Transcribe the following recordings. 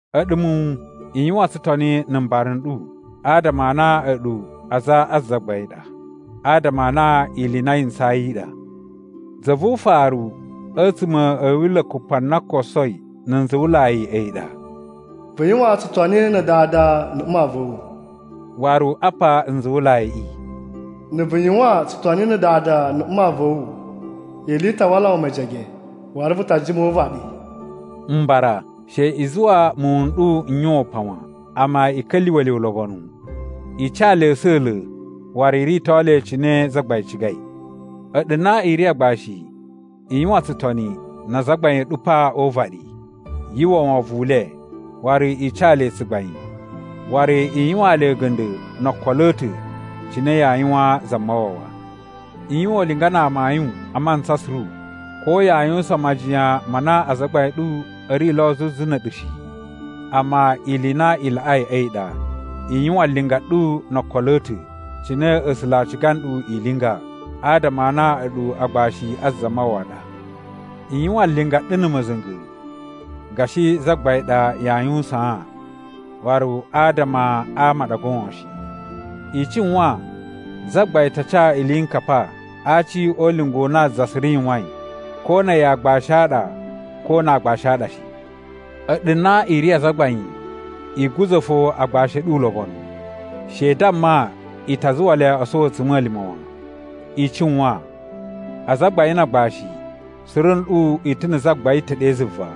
A̱ɗu muwun, i yuwan tsutoni na̱ mbara n ɗu adama a na a̱ɗu aza a Zagbain ɗa, adama a na ili i na yi ntsayi i ɗa. Za vu ufaru a̱tsuma̱ a̱ Wila̱ Kupa na kosoi na̱ nzuwulai a̱yi ɗa: “Vu yuwan tsutoni na̱ dada na̱ mma va̱ wu.” Waru apa nzuwulaiꞌi: “Na̱ vu yuwan tsutoni na̱ dada na̱ mma va̱ wu, ili i ta wala wu mejege, waru vu ta jima o uvaɗi.” Mbara, she i zuwa muwun n ɗu n yuwan upan wan. Amma, i ka̱lyuwa̱ le ulobonu, i ca le a̱sa̱la̱ waru i rito le cine Zagbain cigai. A̱ɗu na i ri agbashi, i yuwan tsutoni na azagbain a̱ ɗu pa o uvaɗi. Yu uwwa wovon u le, waru i ca le tsugbain, waru i yuwaan le a̱ga̱nda̱ no okolo a̱ ta̱ cine yaa yuwaan Zamawawa. I yuwan ulinga na amayun a mantsa suru, ko yaa yuwusan majiyan ma na azagbain a̱ ɗu a̱ ri lo zuzu na̱ a̱ɗu shi. Amma ili i na i laꞌai a̱yi ɗa i yuwan linga ɗu no okolo a̱ ta̱, cine A̱sula̱ a̱ ciga nɗu i linga, adama a na a̱ɗu agbashi a Zamawawa a ɗa. I yuwan linga ɗu na̱ ma̱za̱nga̱, gashi Zagbain ɗa yaa yuwusaan, waru adama a ama a ɗa goon shi. I cuwan Zagbain ta ca iliyinkapa a aci o ulinga u na za suru yuwain, ko na̱ a̱yi a aagbashi a ɗa ko na aagbashi a ɗa shi. A̱ɗu na i ri azagbain, i guza̱ fo agbashi a̱ ɗu ulobonu. She i damma i ta zuwa le o sowo a̱tsuma̱lima̱ wan. I cuwan, azagbain na agbashi, suru nɗu i ta̱ na̱ Zagbain ta̱ ɗe zuva,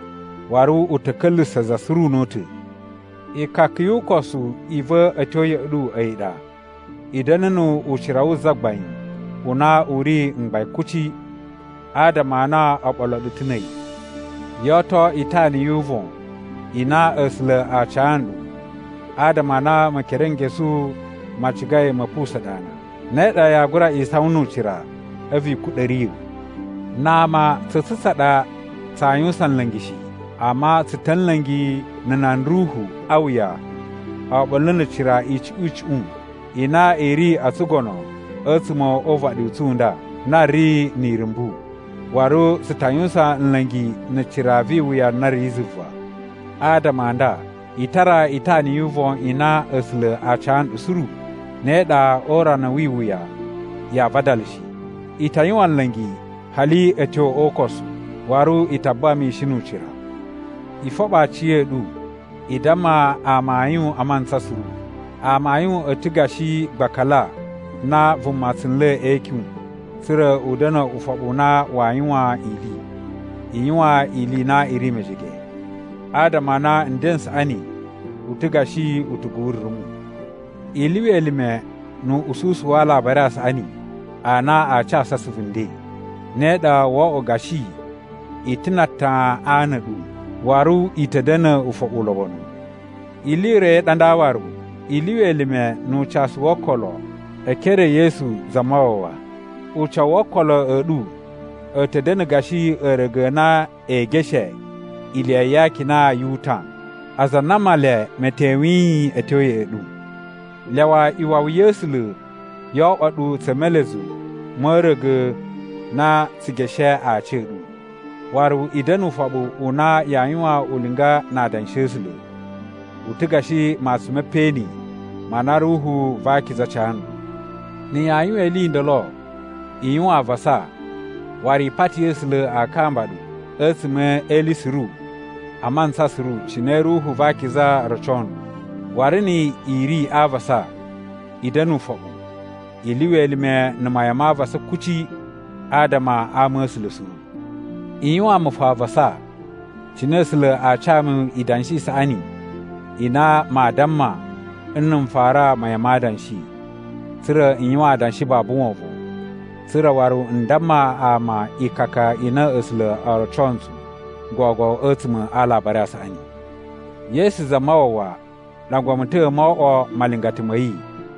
waru u ta̱ ka̱lyuwusa̱ za suru una̱ta̱. Ikaka yu ukosu i va̱ a̱ tyo ya̱ꞌa̱ ɗu a̱yi ɗa: I da̱na̱ nu ucira wu Zagbain u na u ri mgbain kuci, adama a na o ɓolo ɗu ta̱ na̱ a̱yi. Yo oto itana yu uvon i na A̱sula̱ a ca nɗu adama a na Mekerenkesu ma cigai ma̱ pusa̱n ɗu ana, ne ɗa yaa gura isawan nu ucira a̱vu i kuɗa̱ riya̱. Na ama tsa̱ tsu tsa ɗa tsaa yuwusan nla̱ngi shi, amma tsu ta̱ nla̱ngi na̱ nan ruhu a wuya oɓolo na̱ cira icuꞌun icuꞌun i na i ri o tsugono a̱tsuma̱ o uvaɗi u tsu u nda na ri ni irumbu, waru tsu ta yuwusan nla̱ngi na̱ cira vi iwuya na ri zuva. Adama a nda, i tara itana yu uvon i na A̱sula̱ a ca nɗu suru. Ne ɗa o urana wi iwuya yaa vadala shi. I ta yuwan nla̱ngi hali a̱ tyo o ukosu, waru i ta buwa mishin nu ucira. I foɓo aciya̱ɗu! I damma amayun a mantsa suru. Amayun a̱ ta̱ gashi gbakala na vuma tsu nla̱ e ikyun tsa̱ra̱ u da̱na̱ ufoɓu u na waa yuwan ili. I yuwan ili i na i ri mejege, adama a na nden n saꞌani u ta̱ gashi utugu wu rumu. I lyuwa elime nu uꞌususu wa Alabari a Saꞌani a na a casu asuvu nden. Ne ɗa wo oꞌwo gashi i ta̱ na atan a ana a̱ ɗu, waru i ta̱ da̱na̱ ufoɓu ulobonu. Ili i ro i ɗa nda waru: I lyuwa elime nu ucasu wo okolo e ekere e Yesu Zamawawa. Ucawu wo okolo a̱ ɗu a̱ ta̱ da̱na̱ gashi a̱a̱ra̱ga̱ a na ee geshe iliya ya akina yu utan, aza a na Male me tewiyin a̱ tyo ya̱ꞌa̱ ɗu. Lyawa iwawi ya̱ A̱sula̱ yo oꞌwo ɗu tsa̱ melezu ma̱ a̱a̱ra̱ga̱ na tsu geshe aci a̱ ɗu. Waru i da̱na̱ ufoɓu u na yaa yuwan ulinga na Adanshi a̱ A̱sula̱. U ta̱ gashi matsun me peꞌeni ma na Ruhu va Akiza ca nɗu. Na̱ yaa yuwan ili i ndolo, i yuwan avasa waru i pati A̱sula̱ a kamba ɗu a̱tsuma̱ e ili suru a mantsa suru cine Ruhu va Akiza roco nɗu. Waru ni i ri a avasa, i da̱na̱ ufoɓu. I lyuwa elime na̱ mayan ma avasa kuci adama a ama a̱ A̱sula̱ suru. I yuwaan mu fo avasa, cine A̱sula̱ a ca mu idanshi i saꞌani i na maa damma n na̱ n fara mayan ma adanshi, tsa̱ra̱ n yuwan adanshi babu wovon, tsa̱ra̱ waru n damma ama ikaka i na A̱sula̱ o roco ntsu gogo a̱tsuma̱ a Alabari a Saꞌani. Yesu Zamawawa ɗangwa mu ta̱ mo oꞌwo malingata ma̱ yi,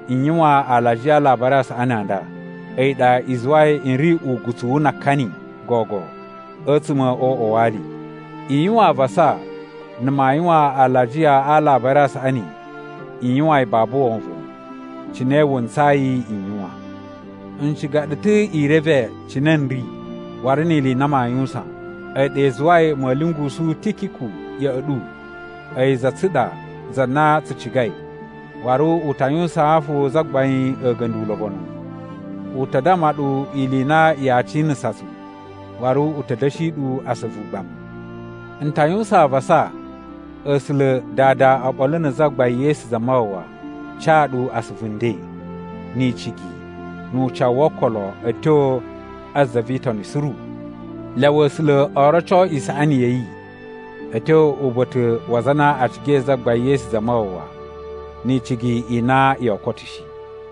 n yuwan alajiya a Alabari a Saꞌani a nda, a̱yi ɗa i zuwai n ri ugutsuwu na akani gogo a̱tsuma̱ o uꞌwa wa ali. I yuwan avasa na̱ maa yuwan alajiya a Alabari a Saꞌaniꞌi n yuwan yi babu wovon, cine wu ntsayi n yuwan. N ciga ɗu ta̱ i reve cine n ri waru ni ili i na maa yuwusan. A̱yi ɗa i zuwai ma̱a̱ lyungusu Tikiku ya̱ꞌa̱ ɗu. A̱yi za tsu ɗa za na tsu cigai, waru u ta yuwusaan fo Zagbain a̱ga̱nda̱ ulobonu. U ta damma ɗu ili i na yaa cinasa tsu, waru u ta̱ da̱shi ɗu asuvu ugbamu. N ta yuwusan avasa A̱sula̱ Dada oɓolo na̱ Zagbain Yesu Zamawawa ca ɗu asuvu nden, ni icigi, nu ucawu wo okolo a̱ tyo a za vi Itoni suru! Lyawa A̱sula̱ o roco isaꞌani ya̱ yi a̱ tyo uba̱ta̱ wa aza a na a cigai Zagbain Yesu Zamawawa ni icigi i na yoo koto shi.